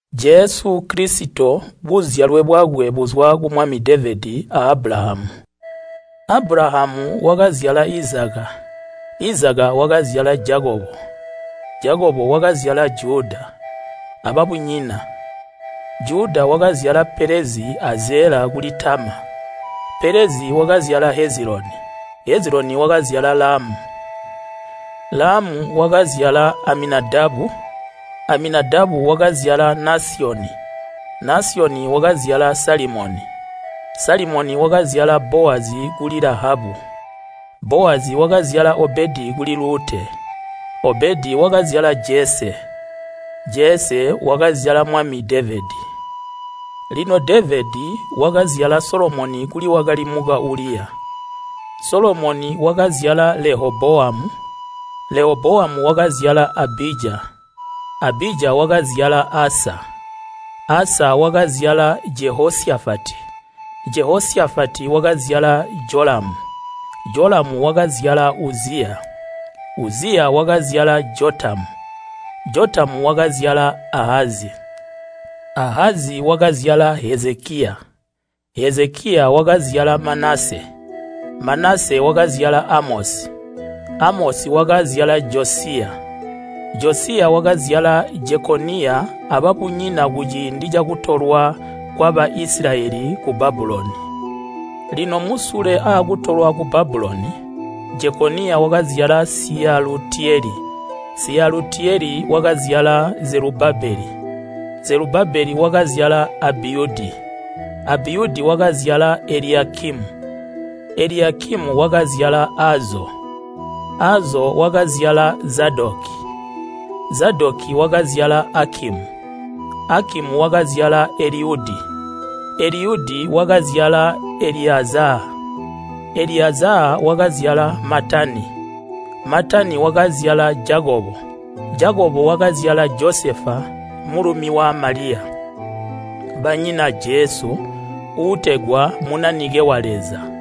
Jesu Kilisito buzyalwe bwakwe buzwa ku mwami Devedi a Abulahamu. Abulahamu wakazyala Izaka, Izaka wakazyala Jakobo, Jakobo wakazyala Juda, ababunyina. Juda wakazyala Pelezi a Zela kuli Tama, Pelezi wakazyala Heziloni, Heziloni wakazyala Lamu. Lamu wakazyala Aminadabu, Aminadabu wakazyala Nasyoni, Nasyoni wakazyala Salimoni. Salimoni wakazyala Bowazi kuli Lahabu, Bowazi wakazyala Obedi kuli Lute, Obedi wakazyala Jese. Jese wakazyala mwami Devedi. Lino Devedi wakazyala Solomoni kuli wakali muka Uliya. Solomoni wakazyala Lehobowamu, Lehobowamu wakazyala Abija, Abija wakazyala Asa. Asa wakazyala Jehosyafati, Jehosyafati wakazyala Jolamu, Jolamu wakazyala Uziya, Uziya wakazyala Jotamu, Jotamu wakazyala Ahazi, Ahazi wakazyala Hezekiya. Hezekiya wakazyala Manase, Manase wakazyala Amosi, Amosi wakazyala Josiya. Josiya wakazyala Jekoniya ababunyina kuciindi cakutolwa kwa Baisilayeli ku Babuloni. Lino musule aakutolwa ku Babuloni, Jekoniya wakazyala Syiyalutiyeli, Syiyalutiyeli wakazyala Zelubabeli. Zelubabeli wakazyala Abiyudi. Abiyudi wakazyala Eliyakimu, Eliyakimu wakazyala Azo. Azo wakazyala Zadoki, Zadoki wakazyala Akimu, Akimu wakazyala Eliyudi. Eliyudi wakazyala Eliyazaa, Eliyazaa wakazyala Matani, Matani wakazyala Jakobo. Jakobo wakazyala Josefa mulumi wa Maliya, banyina Jesu uutegwa Munanike wa Leza.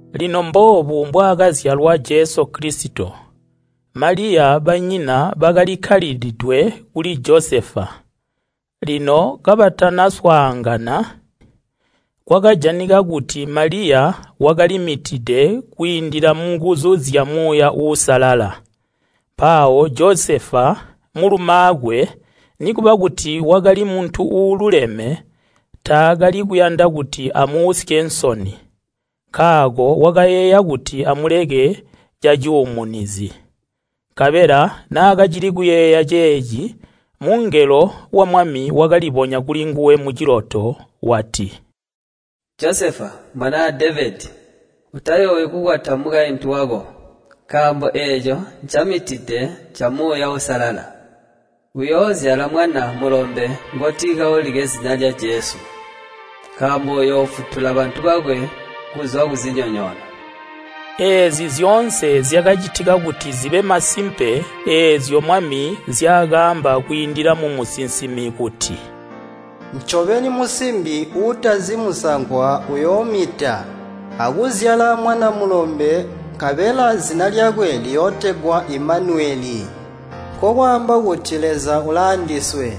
Lino mboobu mbwaakazyalwa Jesu Kilisito. Maliya banyina bakalikkalidwe kuli Josefa, lino kabatana swaangana, kwakajanika kuti Maliya wakalimitide kwiindila munguzu zya Muuya Uusalala. Mpawo Josefa mulumaakwe, nikuba kuti wakali muntu uululeme, alimwi mbwaatakali kuyanda kuti amuusye nsoni, wakayeeya kuti amuleke cacuumunizi. Nkabela naakacili kuyeeya ceeci, mungelo wa Mwami wakalibonya kuli nguwe muciloto wati, “Josefa, mwanaa Devedi, utayoowi kukwata mukaintu wako, nkaambo eeco ncamitide nca Muuya Uusalala. Uyoozyala mwana mulombe ngoti kaulike zina lya Jesu, nkaambo uyoofutula bantu bakwe kuzwa kuzinyonyoono.” Eezi zyoonse zyakacitika kuti zibe masimpe eezyo Mwami zyaakaamba kwiindila mumusinsimi kuti, “Ncobeni musimbi uutazi musankwa uyoomita, akuzyala mwana mulombe nkabela zina lyakwe liyootegwa Imanuweli,” nkokwaamba kuti Leza ulaandiswe.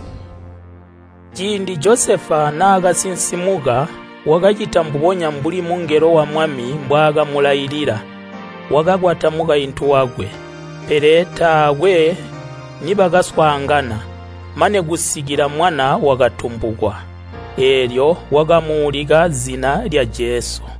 Ciindi Josefa naakasinsimuka wakacita mbubonya mbuli mungelo wa Mwami mbwaakamulailila, wakakwata mukaintu wakwe. Pele taakwe nibakaswaangana, mane kusikila mwana wakatumbukwa, eelyo wakamuulika zina lya Jesu.